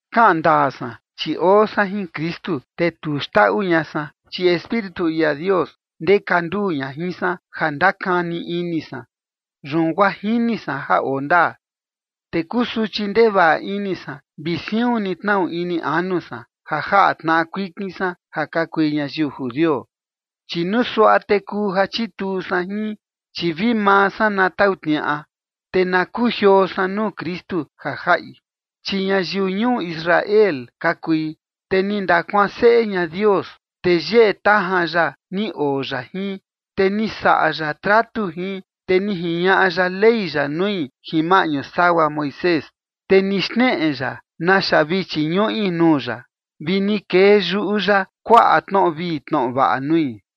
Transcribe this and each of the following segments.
Kaꞌan ndaa san, chi oo san jin Kristu, te tu xndaꞌu ña san, chi Espíritu ia Dios ndeka nduu ña jin san ja ndakani ini san, yun guaa jini san ja oo ndaa. Te kusuchi ndevaꞌa ini san vi siun ni tnaꞌu ini anu san, ja jaꞌa tnaꞌa kuikin san ja ka kui ñayiu judio, chi nuu suaꞌa te kuu ja chituu san jin, chi vi maa san na tau tniaꞌa, te na kujioo san nuu Kristu ja jaꞌi. Chi ñayiu ñuu Israel ka kui, te ni ndakuanseꞌe ña Dios, te yeꞌe tajan ya ni oo ya jin, te ni saꞌa ya tratu jin, te ni jiñaꞌa ya Ley ya nui jin maꞌñu sagua Moisés, te ni xneꞌe ya naxa vi chiñuꞌi nuu ya, vi ni kee yuꞌu ya kuaꞌa tnoꞌo vii tnoꞌo vaꞌa nui.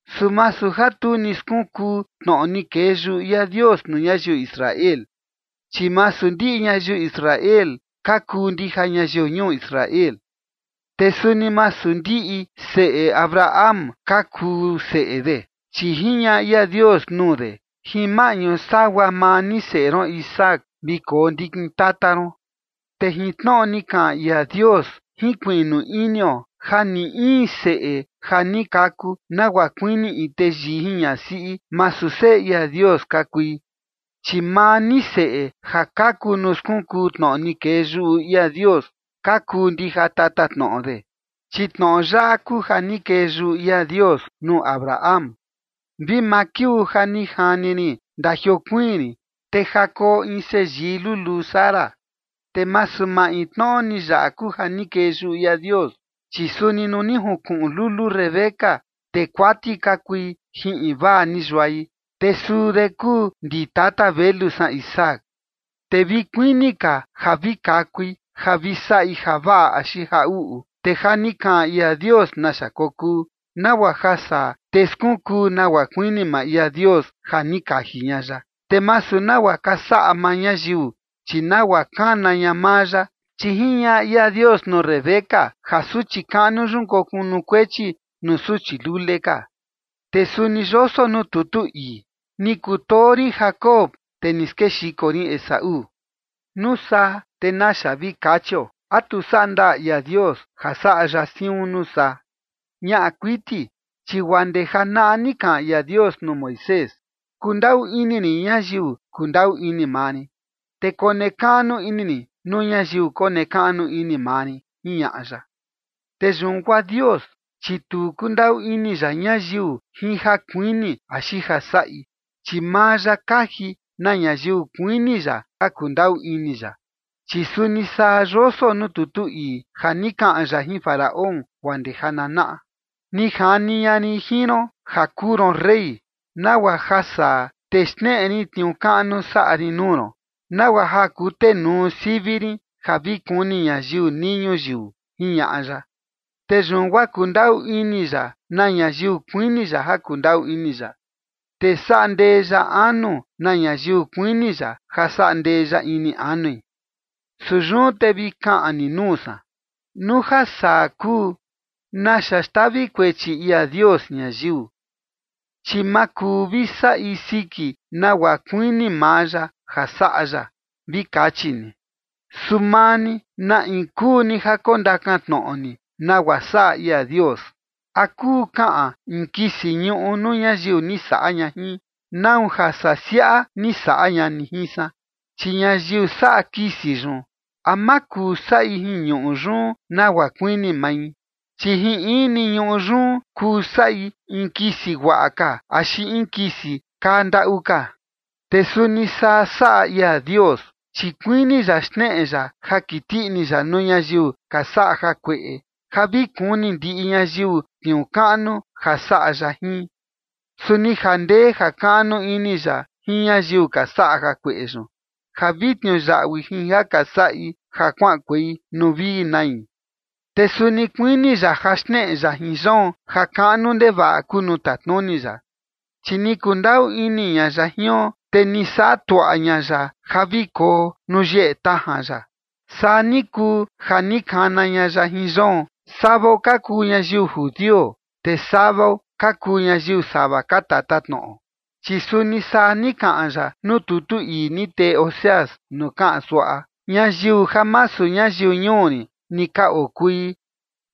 Su masu ja tu ni skunkuu tnoꞌo ni kee yuꞌu ia Dios nuu ñayiu Israel, chi masu ndiꞌi ñayiu Israel ka kuu ndija ñayiu ñuu Israel. Te suni masu ndiꞌi seꞌe Abraham ka kuu seꞌe de, chi jiñaꞌa ia Dios nuu de: “Jin maꞌñu sagua maa ni seꞌe ron Isaac vi koo ndikin tata ron”. Te jin tnoꞌo ni kaꞌan ia Dios jinkuiꞌnu inio ja ni in seꞌe ja ni kaku nagua kuini in teyii jin ñasiꞌi, masu seꞌe ia Dios ka kui, chi maa ni seꞌe ja kaku nuu skunkuu tnoꞌo ni kee yuꞌu ia Dios ka kuu ndija tatatnoꞌo de. Chi tnoꞌo yaꞌa kuu ja ni kee yuꞌu ia Dios nuu Abraham: “Vi maa kiuu ja ni jani rin, ndajiokuiin rin te ja koo in seyii luluu Sara”. Te masu maintnoꞌo ni yaꞌa kuu ja ni kee yuꞌu ia Dios, chi suni nuu ni junkuꞌun lulu Rebeca, te kuati ka kui jin invaa ni yuai, te suu de kuu ndi tata velu san Isaac. Te vi kuini ka ja vi kakui ja vi saꞌi javaꞌa axi ja uꞌu, te ja ni kaꞌan ia Dios naxa kokuu, nagua ja saa, te skunkuu nagua kuini maa ia Dios ja ni kaji ña ya, te masu nagua ka saꞌa maa ñayiu, chi nagua kana ña maa ya. Chi jiñaꞌa ia Dios nuu Rebeca ja suchi kaꞌnu yun kokunukuechi nuu suchi lule ka. Te suni yoso nuu tutu ii: “Ni kutoo rin Jacob, te ni skexiko rin Esaú”. Nuu saa, ¿te naxa vi kachio? ¿A tu saꞌa ndaa ia Dios ja saꞌa ya siun nuu saa? Ñaꞌa kuiti. Chi guaa ndee janaꞌa ni kaꞌan ia Dios nuu Moisés: “Kundaꞌu ini rin ñayiu kundaꞌu ini maa rin, te konekaꞌnu ini rin nuu ñayiu konekaꞌnu ini maa rin”, jiñaꞌa ya. Te yun guaa Dios, chi tu kundaꞌu ini ya ñayiu jin ja kuini axi ja saꞌi, chi maa ya kaji na ñayiu kuini ya ja kundaꞌu ini ya. Chi suni saa yoso nuu tutu ii ja ni kaꞌan ya jin Faraón guaa ndee jananaꞌa: “Ni jani ña rin jin ron ja kuu ron rey, nagua ja saa te xneꞌe rin tniuu kaꞌnu saꞌa rin nuu ron, nagua ja kutenuu sivi rin ja vi kuni ñayiu nii ñuyiu”, jiñaꞌa ya. Te yun guaa kundaꞌu ini ya na ñayiu kuini ya ja kundaꞌu ini ya, te saꞌa ndee ya anu na ñayiu kuini ya ja saꞌa ndee ya ini anui. Su yun te vi kaꞌan ni nuu san: “Nuu ja saa kuu, ¿te naxa xtavi kuechi ia Dios ñayiu? Chi ma kuu vi saꞌi siki nagua kuini maa ya ja saꞌa ya”, vi kachi ni. Su maa ni, ¿na in kuu ni ja kondakan tnoꞌo ni nagua saꞌa ia Dios? ¿A kuu kaꞌan in kisi ñuꞌu nuu ñayiu ni saꞌa ña jin: “¿Nau ja saa siaꞌa ni saꞌa ña ni jin san?” Chi ñayiu saꞌa kisi yun, ¿a ma kuu saꞌi jin ñuꞌu yun nagua kuini mai? Chi jin in ni ñuꞌu yun kuu saꞌi in kisi guaꞌa ka axi in kisi kaa ndaꞌu ka. Te suni saa saꞌa ia Dios, chi kuini ya xneꞌe ya ja kiti ini ya nuu ñayiu ka saꞌa jakueꞌe ja vi kuni ndiꞌi ñayiu tniuu kaꞌnu ja saꞌa ya jin. Su ni jandee jakaꞌnu ini ya jin ñayiu ka saꞌa jakueꞌe yun, ja vi tniuyaꞌui jin ja ka saꞌi, ja kuaꞌankuei nuu vi nai. Te suni kuini ya ja xneꞌe ya jin yoon ja kaꞌnu ndevaꞌa kuu nuu tatnuni ya, chi ni kundaꞌu ini ña ya jion, te ni saꞌa tuaꞌa ña ya ja vi koo nuu yeꞌe tajan ya. Saa ni kuu ja ni kana ña ya jin yoon, savao ka kuu ñayiu judio, te savao ka kuu ñayiu sava ka tatatnoꞌo. Chi suni saa ni kaꞌan ya nuu tutu ii ni tee Oseas nuu kaꞌan suaꞌa: Ñayiu ja masu ñayiu ñuu rin ni ka okui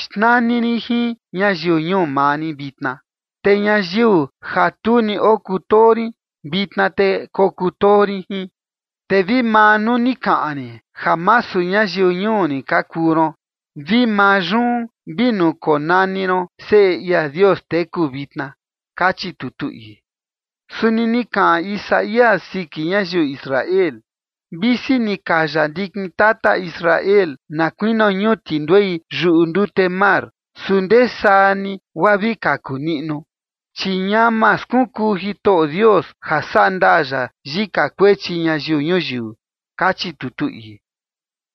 xnani rin jin ñayiu ñuu maa rin vitna, te ñayiu ja tu ni okutoo rin, vitna te kokutoo rin jin. Te vi maa nuu ni kaꞌan rin ja masu ñayiu ñuu rin ka kuu ron, vi maa yun vi nuu konani ron seꞌe ia Dios teku, vitna, kachi tutu ii. Suni ni kaꞌan Isaías siki ñayiu Israel: “Visi ni kaya ndikin tata Israel na kuinio ñuti nduei yuꞌu ndute mar, su ndesaa ni guaa vi kaku niꞌnu, chi ñama skunkuu Jitoꞌo Dios ja sandaa ya yika kuechi ñayiu ñuyiu”, kachi tutu ii.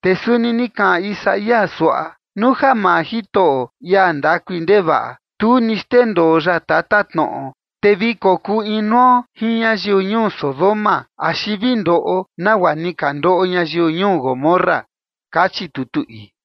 Te suni ni kaꞌan Isaías suaꞌa: Nuu ja maa Jitoꞌo ia ndakui ndevaꞌa, tu ni xndendoo ya tatatnoꞌo, te vi kokuu inuo jin ñayiu ñuu Sodoma axi vi ndoꞌo nagua ni ka ndoꞌo ñayiu ñuu Gomorra, kachi tutu ii.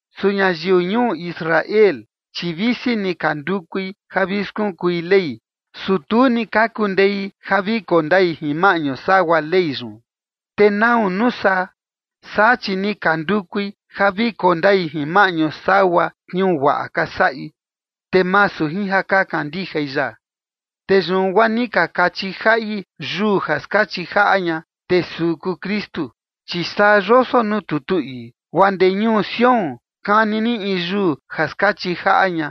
Su ñayiu ñuu Israel, chi visi ni ka ndukui ja vi skunkui Ley, su tu ni ka kundei ja vi koo ndai jin maꞌñu sagua Ley yun. ¿Te nau, nuu saa? Saa, chi ni ka ndukui ja vi koo ndai jin maꞌñu sagua tniuu guaꞌa ka saꞌi, te masu jin ja ka kandijai ya. Te yun guaa ni ka kachi jaꞌi yuu ja skachi jaꞌa ña, te suu kuu Kristu. Chi saa yoso nuu tutu ii: Guaa ndee ñuu Sión kani rin in yuu ja skachi jaꞌa ña,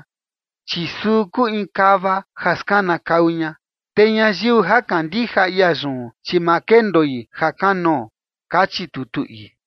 chi suu kuu in kava ja skanakau ña. Te ñayiu ja kandija ia yun, chi ma kendoi ja kanoo, kachi tutu ii.